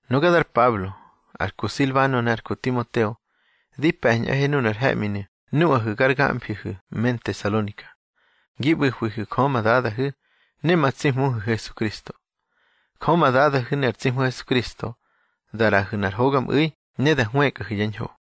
Nuga dar Pablo, ar ku Silbano ne ar ku Timoteo di pe̱ñꞌahe nunar he̱ꞌminu̱ nuꞌahu̱ gar gamfihu̱ me Ntesalonika, gi ꞌbu̱hwihu̱ Jö ma Dadahu̱ ne ma tsi Hmuhu̱ Hesukristo. Jö ma Dadahu̱ ne ar tsi Hmu Hesukristo da ꞌraꞌahu̱ nꞌar hogamꞌu̱i ne da hwëkꞌahu̱ yá ñho.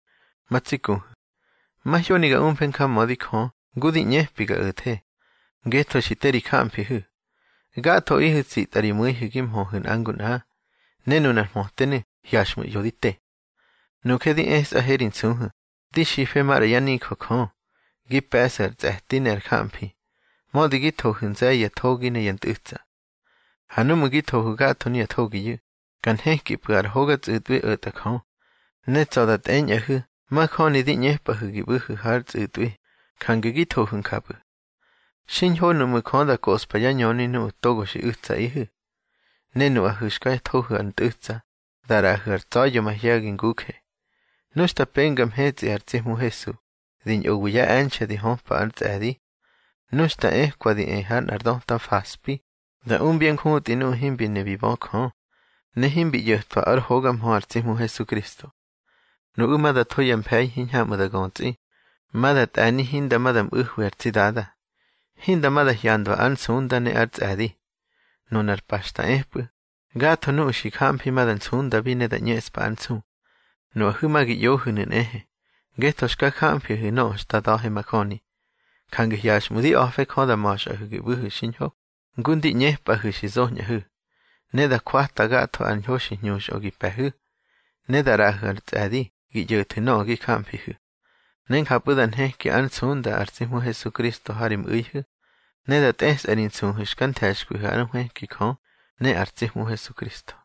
Ma tsi kuhu̱, mahyoni ga umfe njamödi Jö ngu di ꞌñepi ga o̱the, ngetho xi te ri jamfihu̱. Gathoꞌihu̱ tsitꞌa ri mu̱ihu̱ gi mhöhu̱ nꞌa ngu nꞌa, ne nunar mhötenu̱ hyaxꞌmu̱ ꞌyo di te. Nuje di esꞌahe ri nsuhu̱, di xife maꞌra yá nijö Jö, gi pe̱ꞌsu̱ ar tsꞌe̱ti ne ar jamfi, mödi gi thohu̱ nze̱ye̱ ya thogi ne ya ntꞌu̱tsa. Ha núꞌmu̱ gi thohu̱ gatho nuya thogiyu̱, ka nhekipꞌu̱ ar hoga tsꞌu̱tꞌwi o̱tꞌa Jö. Ne tsa̱ da tꞌeñꞌahu̱ majöni di ꞌñepꞌahu̱ gi ꞌbu̱hu̱ hár tsꞌu̱tꞌwi, jange gi thohu̱ njapꞌu̱. Xiñho nuꞌmu̱ Jö da koꞌspa yá ñöni nuꞌu̱ togo xi u̱tsaꞌihu̱. Ne nuꞌahu̱ xka thohu̱ ar ntꞌu̱tsa, da ꞌraꞌahu̱ ar tsa̱ya̱ mahye̱gi nguje, nu xta penga mhetsꞌi ar tsi Hmu Hesu, di ñꞌowi ya e̱nxe̱ di höpa ár tsꞌe̱di. Nu xta ekwa di e ha nꞌar döta faspi da umbyá njutꞌi nuꞌu̱ himbi ne bi bö Jö, ne himbi ꞌyo̱twa ár hoga mhö ar tsi Hmu Hesukristo. Nuꞌu̱ ma da tho ya mfe̱i hiñhamꞌu̱ da götsꞌi. Ma da tꞌe̱ni hinda ma da ꞌmu̱hwi ar tsi Dada, hinda ma da hyandwa ár nsunda ne ár tsꞌe̱di. Nunar pa xta epꞌu̱, gatho nuꞌu̱ xi jamfi ma da nsundabi ne da ꞌñeꞌspa ár nsu. Nuꞌahu̱ ma gi ꞌyohu̱nu̱ nꞌehe, ngetho xka jamfihu̱ nöꞌö xta da̱he majöni. Jange hyaxꞌmu̱ di a̱fe Jö da ma̱xꞌahu̱ gi ꞌbu̱hu̱ xiñho, ngu ndi ꞌñepꞌahu̱ xi zoñꞌahu̱. Ne da jwata gatho ar ñho xi hñuxꞌö gi pe̱hu̱, ne da ꞌraꞌahu̱ ár tsꞌe̱di gi ꞌyo̱thu̱ nöꞌö gi jamfihu̱. Ne njapꞌu̱ da nheki ár nsunda ar tsi Hmu Hesukristo ha ri mꞌu̱ihu̱, ne da tꞌesꞌa ri nsuhu̱ xka nthe̱xkwihu̱ ár nhwëki Jö ne ar tsi Hmu Hesukristo.